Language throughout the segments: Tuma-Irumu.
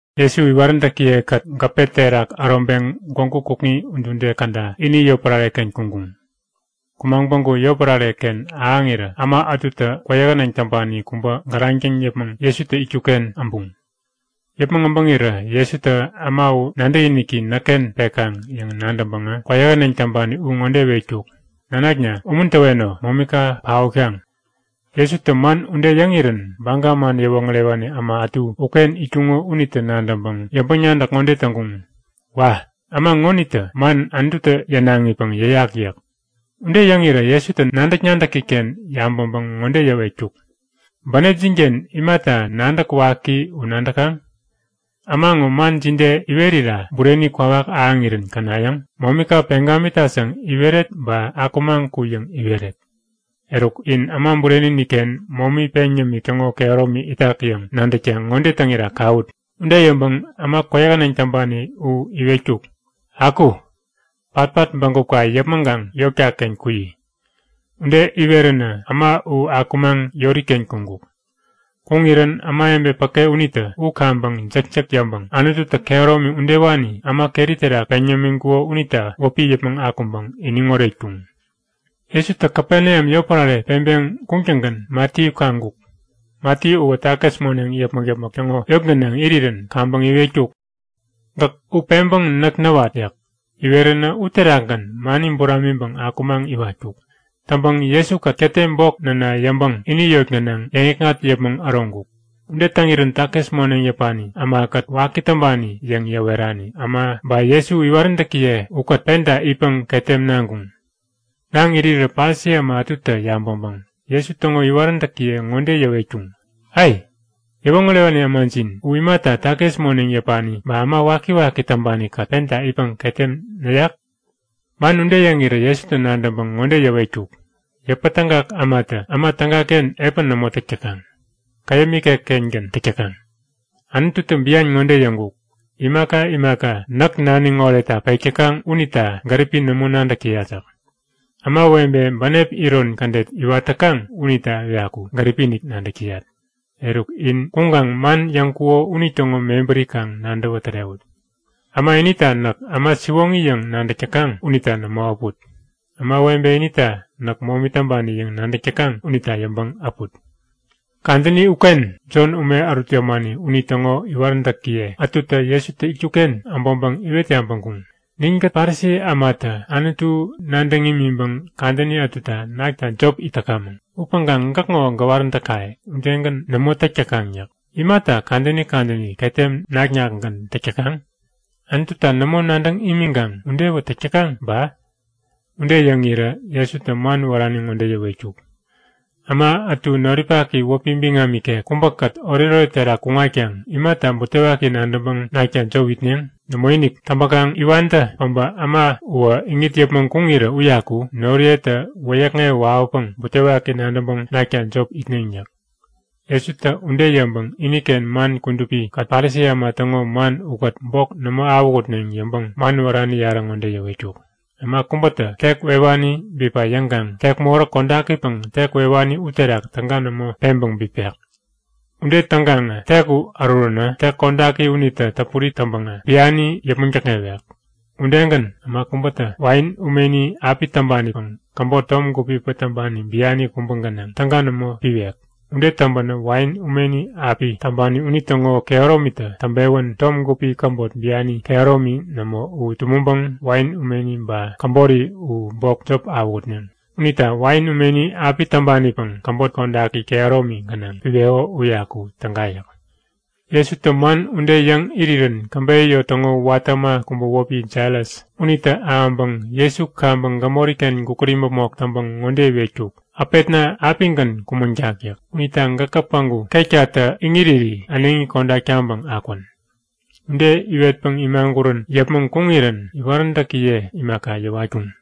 Jesu iwaräntäkiye-kät gäpe terak äroŋpeŋ gwägu kukŋi udude käda ini yotpärare-ken kuŋkuŋ. Kumaŋ päŋku yotpärare-ken ahäŋirä äma ätutä kwäyähäneŋ täŋpani kubä gäraŋ täŋ yäpmäŋ Jesutä itkuk-ken äbuŋ. Yäpmäŋ äbäŋirä Jesutä äma u nadäkiniki näkken pekaŋ yäŋ nadäŋpäŋä kwäyähäneŋ täŋpani u ŋode iwetkuk; Nanakna, umuntäweno. Momika paotkaŋ! Jesutä man ude yäŋirän Baga man yäwoŋärewani äma ätu uken itkuŋo unitä nadäŋpäŋ yäŋpäŋ-nadäk ŋode täŋkuŋ; Wa! Äma ŋonitä man Anututä yänaŋipäŋ yäyak yäk. Ude yäŋirä Jesutä nadäk-nadäki-ken yabäŋpäŋ ŋode yäwetkuk; Bänepjin-ken imata nadäk waki u nadäkaŋ? Äma ŋo man jide iwerira bureni kwawak ahäŋirän känayäŋ? Momika peŋ gamitat yäŋ iweret ba Akumaŋ ku yäŋ iweret? Eruk, in Äma Bureni-inik-ken momi peŋ yämik täŋo kehäromi itak yäŋ nadäkta ŋode täŋira kawut. Ude yäŋpäŋ äma kwäyähäneŋ täŋpani u iwetkuk; Aku! Patpat bägupka yäpmäŋkaŋ yotka-ken kuyi! Ude iweränä äma u akumaŋ yori-ken kuŋkuk. Kuŋirän ämawebe päke unitä u kaŋpäŋ jäkjäk yäŋpäŋ Anututä kehäromi udewani äma keri terak peŋ yämiŋkuko unita wäpi yäpmäŋ akuŋpäŋ iniŋ oretkuŋ. Jesutä Kapeneam yotpärare peŋpeŋ kuŋtäŋgän Matiyu kaŋkuk. Matiyu uwä takis moneŋ yäpmäk-yäpmäk täŋo yot gänaŋ irirän kaŋpäŋ iwetkuk; Gäk u peŋpäŋ näk näwat! yäk. Iweränä uterakgän mani buramiŋpäŋ akumaŋ iwatkuk. Täŋpäŋ Jesu-kät ketem bok näna yäŋpäŋ ini yot gänaŋ yäŋikŋat yäpmäŋ äroŋkuk. Ude täŋirän takis moneŋ yäpani ämakät waki täŋpani yäŋ yäwerani äma ba Jesu iwaräntäkiye ukät penta itpäŋ ketem naŋkuŋ. Naŋ irirä Parisi äma ätutä yabäŋpäŋ Jesu täŋo iwaräntäkiye ŋode yäwetkuŋ; Ai! Yäwoŋärewani ämajin u imata takis moneŋ yäpani ba äma wakiwaki täŋpani-kät penta itpäŋ ketem näyak? Man ude yäŋirä Jesutä nadäŋpäŋ ŋode yäwetkuk; Yäpätägak ämatä äma tägaken epän nämo täk täkaŋ. Käyäm ikek-kengän täk täkaŋ. Anututä bian ŋode yäŋkuk; Imaka imaka näk naniŋ oretta pek täkaŋ unita gäripi nämo nadäk täyat yäk. Ämawebe bänep iron kädet iwat täkaŋ unita uyaku gäripi-inik nadäk täyat. Eruk, in kuŋkaŋ man yäŋkuko unitäŋo mebäri kaŋ nadäwä tärewut. Äma inita näk äma siwoŋi yäŋ nadäk täkaŋ unita nämo äput. Ämawebe inita näk momi täŋpani yäŋ nadäk täkaŋ unita yäŋpäŋ äput. Kadäni uken Jon ume ärut yämani unitäŋo iwaräntäkiye ätutä Jesutä itkuk-ken äbäŋpäŋ iwet yabäŋkuŋ; Ninkät Parisi ämatä Anutu nadäŋ imiŋpäŋ kadäni ätuta nakta jop it täkamäŋ. Upäŋkaŋ gäkŋo gäwaräntäkaye udegän nämo täk täkaŋ yäk. Imata kadäni kadäni ketem nak-nakgän täk täkaŋ? Anututa nämo nadäŋ imiŋkaŋ udewä täk täkaŋ ba? Ude yäŋirä Jesutä man wärani ŋode yäwetkuk; Äma ätu noripaki wäpi biŋam ikek kubäkät oretoret terak kuŋatkaŋ imata butewaki nadäŋpäŋ nakta jop itneŋ? Nämoinik! Täŋpäkaŋ iwantä päbä äma uwä iŋit yäpmäŋ kuŋirä uyaku noriyetä wäyäkŋewä wawäpäŋ butewaki nadäŋpäŋ nakta jop itneŋ yäk. Jesutä ude yäŋpäŋ iniken man kudupi-kät Parisi äma täŋo man ukät bok nämo awähutneŋ yäŋpäŋ man wärani yarä ŋode yäwetkuk; Äma kubätä tek wewani bipa yäŋkaŋ tek moräk kodakipäŋ tek wewani uterak täga nämo peŋpäŋ bipek. Ude täŋkaŋä tek u äruränä tek kodaki unitä täpuri täŋpäŋä biani yäpmäŋ däkŋewek. Udegän, äma kubätä wain umeni api täŋpanipäŋ käbot tom gupipäŋ täŋpani biani kubä gänaŋ täga nämo piwek. Ude täŋpänä wain umeni api täŋpani unitäŋo kehäromitä täŋpewän tom gupi käbot biani kehäromi nämo u tumäŋpäŋ wain umeni ba käbori u bok jop awähutneŋ. Unita wain umeni api täŋpanipäŋ käbot kodaki kehäromi gänaŋ piweko uyaku täga yäk. Jesutä man ude yäŋ irirän käbeyä yot täŋo watä äma kubä wäpi Jairas unitä ahäŋpäŋ Jesu kaŋpäŋ gämori-ken gukut imäpmok täŋpäŋ ŋode iwetkuk; Äpetna apigän kumäŋtak yäk. Unita gäkä päŋku ketkatä iŋiriri äneŋi kodak taŋpäŋ akwän! Ude iwetpäŋ imagurän yäpmäŋ kuŋirän iwaräntäkiye imaka yäwatkuŋ.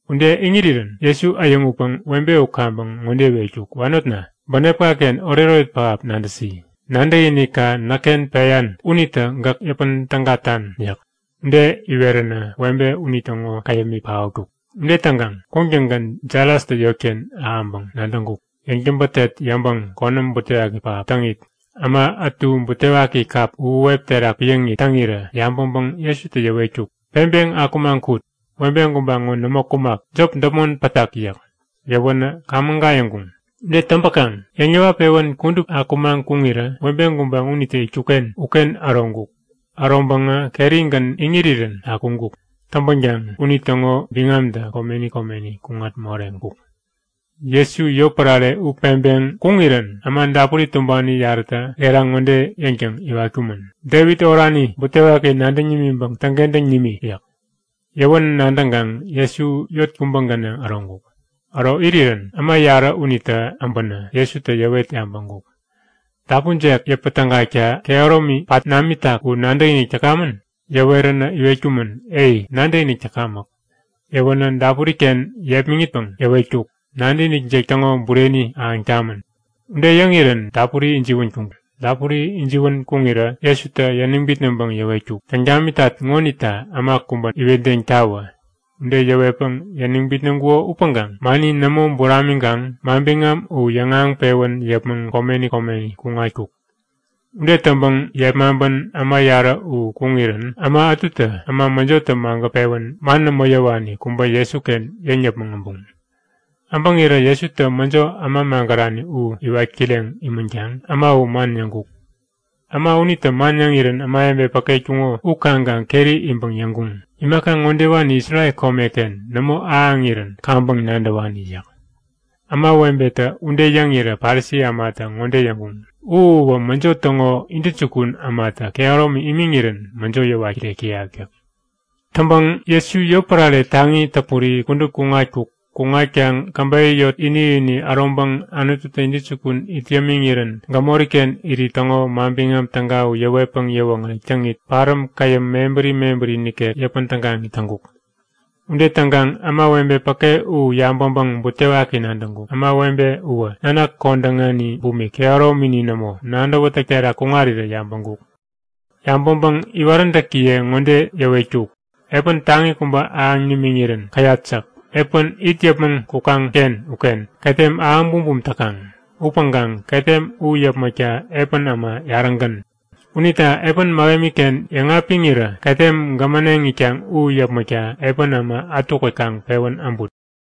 Ude iŋirirän Jesu äyäŋutpäŋ webe u kaŋpäŋ ŋode iwetkuk; Wanotna! Bänepka-ken oretoret pähap nadäsi! Nadäkinikka näkken peyan unitä gäk yäpän tägatan yäk. Ude iweränä webe unitäŋo käyämi paotkuk. Ude täŋkaŋ kuŋtäŋgän Jairastä yotken ahäŋpäŋ nadäŋkuk. Yäŋtäbätet yäŋpäŋ konäm butewaki pähap täŋit äma ätu butewaki kap uhuwep terak piäŋit täŋirä yabäŋpäŋ Jesutä yäwetkuk; Peŋpeŋ akumaŋ kut! Webe gubaŋ u nämo kumak. Jop däpmon pätak yäk. Yäwänä kaŋ-mägayäŋkuŋ. Ude täŋpäkaŋ yäŋ-yäwat-pewän kudup akumaŋ kuŋirä webe gubaŋ unitä itkuk-ken uken äroŋkuk. Äroŋpäŋä kerigän iŋirirän akuŋkuk. Täŋpänkaŋ unitäŋo biŋamtä komeni komeni kuŋat moreŋkuk. Jesu yotpärare u peŋpeŋ kuŋirän äma dapuri tumbani yarätä gera ŋode yäŋtäŋ iwatkumän; Devit orani! Butewaki nadäŋ nimiŋpäŋ täŋkentäŋ nimi! yäk. Yäwän nadäŋkaŋ Jesu yot kubä gänaŋ äroŋkuk. Äro irirän äma yarä unitä äbänä Jesutä yäwet yabäŋkuk; Dapunjek yäpä tägakta kehäromi pat namitak u nadäkinik täkamän? Yäweränä iwetkumän; Ei, nadäkinik täkamäk. Yäwänä dapuri-ken yepmäŋitpäŋ yäwetkuk; Nadäkinikjek täŋo bureni ahäŋ tamän! Ude yäŋirän dapuri ijiwän kuŋkuŋ. Dapuri ijiwän kuŋirä Jesutä yäniŋ bitnäŋpäŋ yäwetkuk; Täŋ tamitat ŋonita äma kubä iwetdeŋtawä! Ude yäwetpäŋ yäniŋ bitnäŋkuko upäŋkaŋ mani nämo buramiŋkaŋ manbiŋam u yäŋahäŋpewän yäpmäŋ komeni komeni kuŋatkuk. Ude täŋpäŋ yepmaŋpän äma yarä u kuŋirän äma ätutä äma mäjotä magät-pewän man nämo yäwani kubä Jesuken yäŋ yäpmäŋ äbuŋ. Äbäŋirä Jesutä mäjo äma magärani u iwat kireŋ imänkaŋ äma u man yäŋkuk. Äma unitä man yäŋirän ämawebe päke itkuŋo u kaŋkaŋ keri iŋpäŋ yäŋkuŋ; Imaka ŋodewani Isrel komeken nämo ahäŋirän kaŋpäŋ nadäwani yäk. Ämawebetä ude yäŋirä Parisi ämatä ŋode yäŋkuŋ; U uwä mäjo täŋo intäjukun ämatä kehäromi imiŋirän mäjo yäwat kirek täyak! yäk. Täŋpäŋ Jesu yotpärare taŋi täpuri kudup kuŋatkuk. Kuŋatkaŋ käbeyä yot ini-ini äroŋpäŋ Anututä intäjukun it yämiŋirän gämoriken irit täŋo Manbiŋam Täga u yäwetpäŋ yäwoŋärek täŋit, paräm käyäm mebäri mebäri nikek yäpän tägaŋit täŋkuk. Ude täŋkaŋ ämawebe päke u yabäŋpäŋ butewaki nadäŋkuk. Ämawebe uwä nanak kodäŋani bumik, kehäromini nämo, nadäwätäk terak kuŋarirä yabäŋkuk. Yabäŋpäŋ iwaräntäkiye ŋode yäwetkuk; Epän taŋi kubä ahäŋ nimiŋirän käyat yäk. Epän it yäpmäŋ kukaŋ-ken uken ketem ahäŋ bumbum täkaŋ. Upäŋkaŋ ketem u yäpmäkta epän äma yarägän. Unita epän mähemi-ken yäŋapiŋirä ketem gämäneŋ itkaŋ u yäpmäkta epän äma ätukät kaŋ pewän äbut.